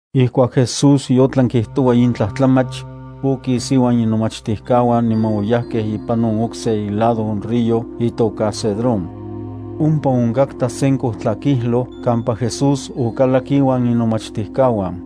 Ijkuak Jesús yotlan kijtoua in tlajtlamach, okis inuan inomachtijkauan niman oyajkej ipan on okse ilado on río itoka Cedrón. Ompa onkatka sen kojtlakijloj kampa Jesús okalak inuan inomachtijkauan.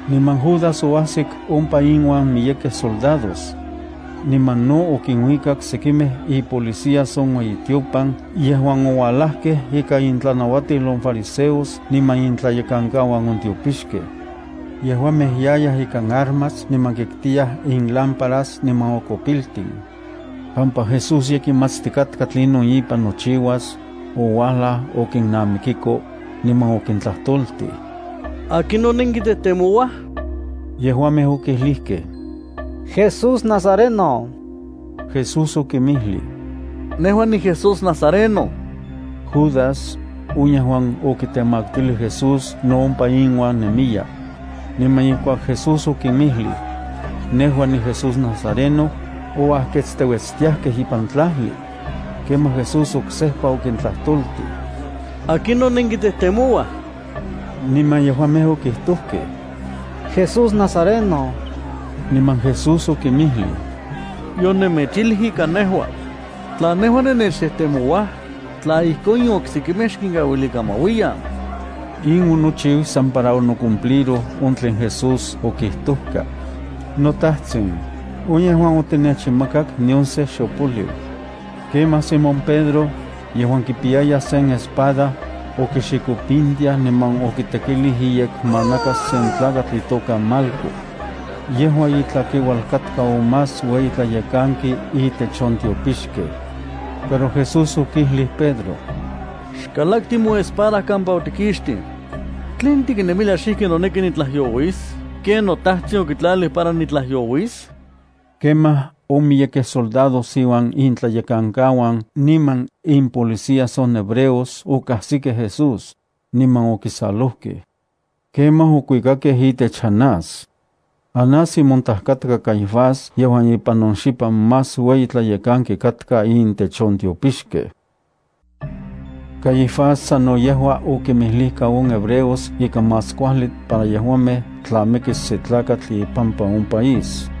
Niman Judas oajsik ompa inuan miyekej soldados. Niman no okinuikak sekimej ipolicías on ueyitiopan yejuan oualajkej ikan intlanauatil on fariseos niman intlayekankauan on tiopixkej. Yejuamej yayaj ikan armas niman kitkiyaj inlámparas niman okopiltin. Pampa Jesús ye kimatstikatka tlinon ipan nochiuas, ouajla okinnamikiko, niman okintlajtoltij: —¿Akinon nenkitejtemouaj? Yejuamej okijlijkej: —Jesús nazareno. Jesús okinmijlij: —Nejua niJesús nazareno. Judas, on yejuan okitemaktilij Jesús no ompa inuan nemiya. Niman ijkuak Jesús okinmijlij: “Nejua niJesús nazareno”, oajketsteuetstiajkej ipan tlajli. Kemaj Jesús oksejpa okintlajtoltij: —¿Akinon nenkitejtemouaj? Niman yejuamej okijtojkej: —Jesús nazareno. Niman Jesús okinmijlij: —Yonemechijlij ika nejua. Tla nejua nennechtejtemouaj, tla ijkon in oksekimej xkinkauilikan ma uiyan. In onochiu san para onocumpliroj on tlen Jesús okijtoka: “On yejuan otinechinmakak nion se xopoliu.” Kemaj Simón Pedro, yejuan kipiyaya sen espada, okixikopintiaj niman okitekilij iyekmanakas sen tlakatl itoka Malco. Yejua itlakeual katka on más ueyi tlayekanki itech on tiopixkej. Pero Jesús okijlij Pedro: —Xkalakti moespada kampa otikixtij. ¿Tlen tiknemilia xijki noneki nitlajyouis ken noTajtsin okitlalij para nitlajyouis? Kemaj on miyekej soldados iuan intlayekankau niman impolicías on hebreos okajsikej Jesús, niman okisalojkej. Kemaj okuikakej itech Anás. Anás imontaj katka Caifás yejuan ipan on xipan más ueyi tlayekanki katka intech on tiopixkej. Caifás sano yejua okinmijlijka on hebreos ika más kuajli para yejuamej tla mikis se tlakatl ipampa on país.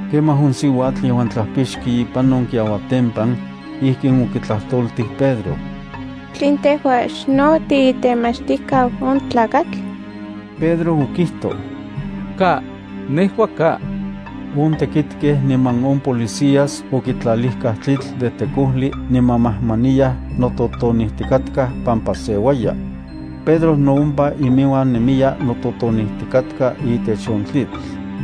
Kemaj on siuatl yejuan tlapixki ipan on kiauatempan, ijkin okitlajtoltij Pedro: —¿Tlen tejua xno tiitemachtijkau on tlakatl? Pedro okijtoj: —Ka, nejua ka. On tekitkej niman on policías okitlalijkaj tlitl de tekojli niman majmaniyaj nototonijtikatkaj pampa seuaya. Pedro no ompa inuan nemiya nototonijtikatka itech on tlitl.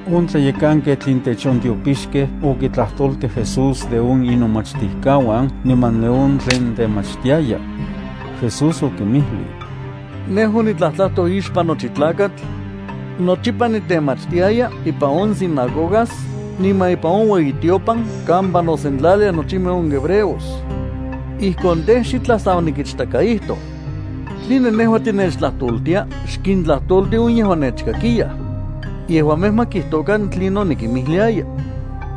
On tlayekanketl intech on tiopixkej okitlajtoltij Jesús de on inomachtijkauan, niman de on tlen kitemachtiaya. Jesús okinmijlij: —Nejua onitlajtlajtoj ixpan nochi tlakatl. Nochipa nitemachtiaya ipan on sinagogas niman ipan on ueyitiopan kampa nosentlaliaj nochimej on hebreos. Ijkon tej, xitlaj san onikichtakaijtoj. ¿Tline nejua tinechtlajtoltia? Xkintlajtolti on yejuan nechkakiyaj. Yejuamej ma kijtokan tlinon nikimijliaya.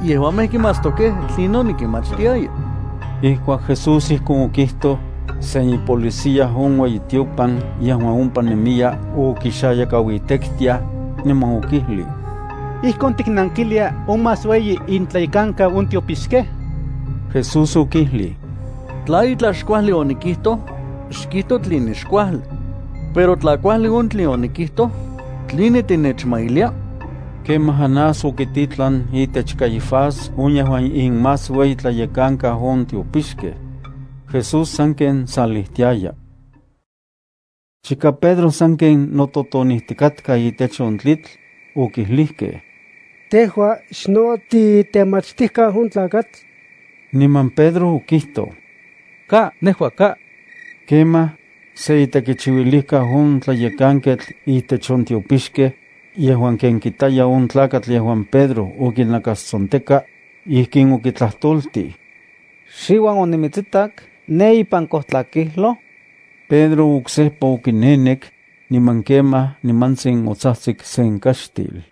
Yejuamej kimatstokej tlinon nikinmachtiaya. Ijkuak Jesús ijkon okijtoj, sen ipolicía on ueyitiopan yejuan ompa nemiya okixayakauitektiaj, niman okijlij: —¿Ijkon tiknankilia on más ueyi intlayekankau on tiopixkej? Jesús okijlij: —Tla itlaj xkuajli onikijtoj, xkijto tline xkuajli. Pero tla kuajli on tlen onikijto, ¿tline tinechmailia? Kemaj Anás okititlan itech Caifás on yejuan inmasueyitlayekankau on tiopixkej. Jesús sanken salijtiaya. Chika Pedro sanken nototonijtikatka itech on tlitl, okijlijkej: —¿Tejua xno tiitemachtijkau on tlakatl? Niman Pedro, okijtoj: —Ka, nejua ka. Kemaj se itekichiuilijkau on tlayekanketl itech on tiopixkej, yejuan ken kitaya on tlakatl yejuan Pedro okinakastsonteka, ijkin okitlajtoltij: —¿Xiuan onimitsitak ne ipan kojtlakijloj? Pedro oksejpa okinenek, niman kemaj nimantsin otsajtsik sen kaxtil.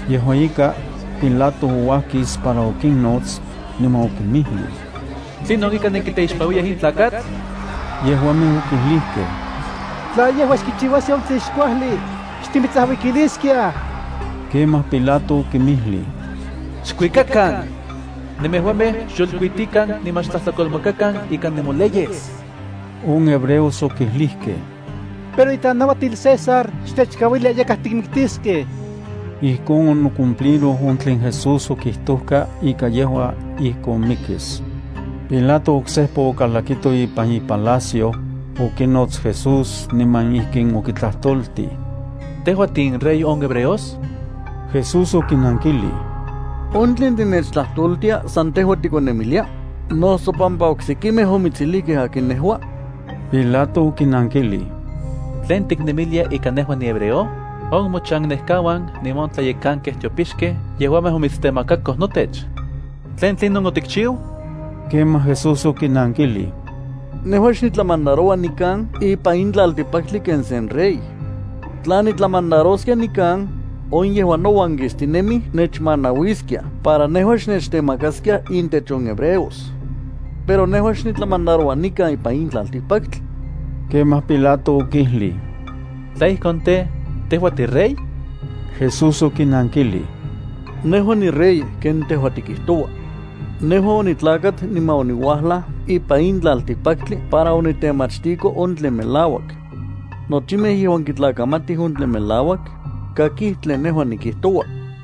Yejua ika, Pilato ouajkis para okinnots, niman okinmijlij: —¿Tlinon ika nenkiteixpanuiyaj in tlakatl? Yejuamej okijlijkej: —Tla yejua xkichiuaskia on tlen xkuajli, xtimitsajuikiliskiaj. Kemaj Pilato okinmijlij: —Xkuikakan. Nemejuamej xyolkuitikan niman xtlajtlakolmakakan ika on nemoleyes. On hebreos okijlijkej: —Pero itlanauatil César xtechkauilia yakaj tikmiktiskej. Ijkon onocumpliroj on tlen Jesús okijtojka ika yejua ijkon mikis. Pilato oksejpa okalakito ipan ipalacio, okinots Jesús niman ijkin okitlajtoltij: —¿Tejua tiinRey on hebreos? Jesús okinankijlij: —¿On tlen tinechtlajtoltia san tejua tikonnemilia, noso pampa oksekimej omitsijlijkej akin nejua? Pilato okinankijlij: —¿Tlen tiknemilia ika nejua nihebreo? On mochannekauan niman on tlayekankej tiopixkej yejuamej omitstemakako notech. ¿Tlen tlinon otikchiu? Kemaj Jesús okinankilij: —Nejua xnitlamandaroua nikan ipan in tlaltikpaktli ken se rey. Tla nitlamandaroskia nikan, on yejuan nouan kistinemij nechmanauiskiaj para nejua xnechtemakaskiaj intech on hebreos. Pero nejua xnitlamandaroua nikan ipan in tlaltikpaktli. Kemaj Pilato okijlij: —Tla ijkon tej, ¿tejua tiRey? Jesús okinankilij: —Nejua niRey ken tejua tikijtoua. Nejua onitlakat niman oniuajlaj ipan in tlaltikpaktli para onitemachtiko on tlen melauak. Nochimej yejuan kitlakamatij on tlen melauak, kakij tlen nejua nikijtoua.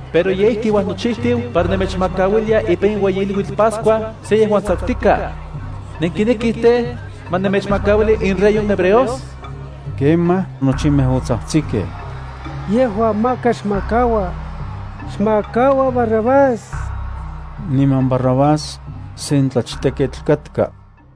Pero ye ijki uajnochijtiu para nemechmakauilia ipan in ueyi iluitl Pascua se yejuan tsakutikaj. ¿Nenkinekij tej, ma nemechmakauili inRey on hebreos? Kemaj nochimej otsajtsikej: —¡Yejua maka xmakaua! ¡Xmakaua Barrabás! Niman Barrabás, sen tlachteketl katka.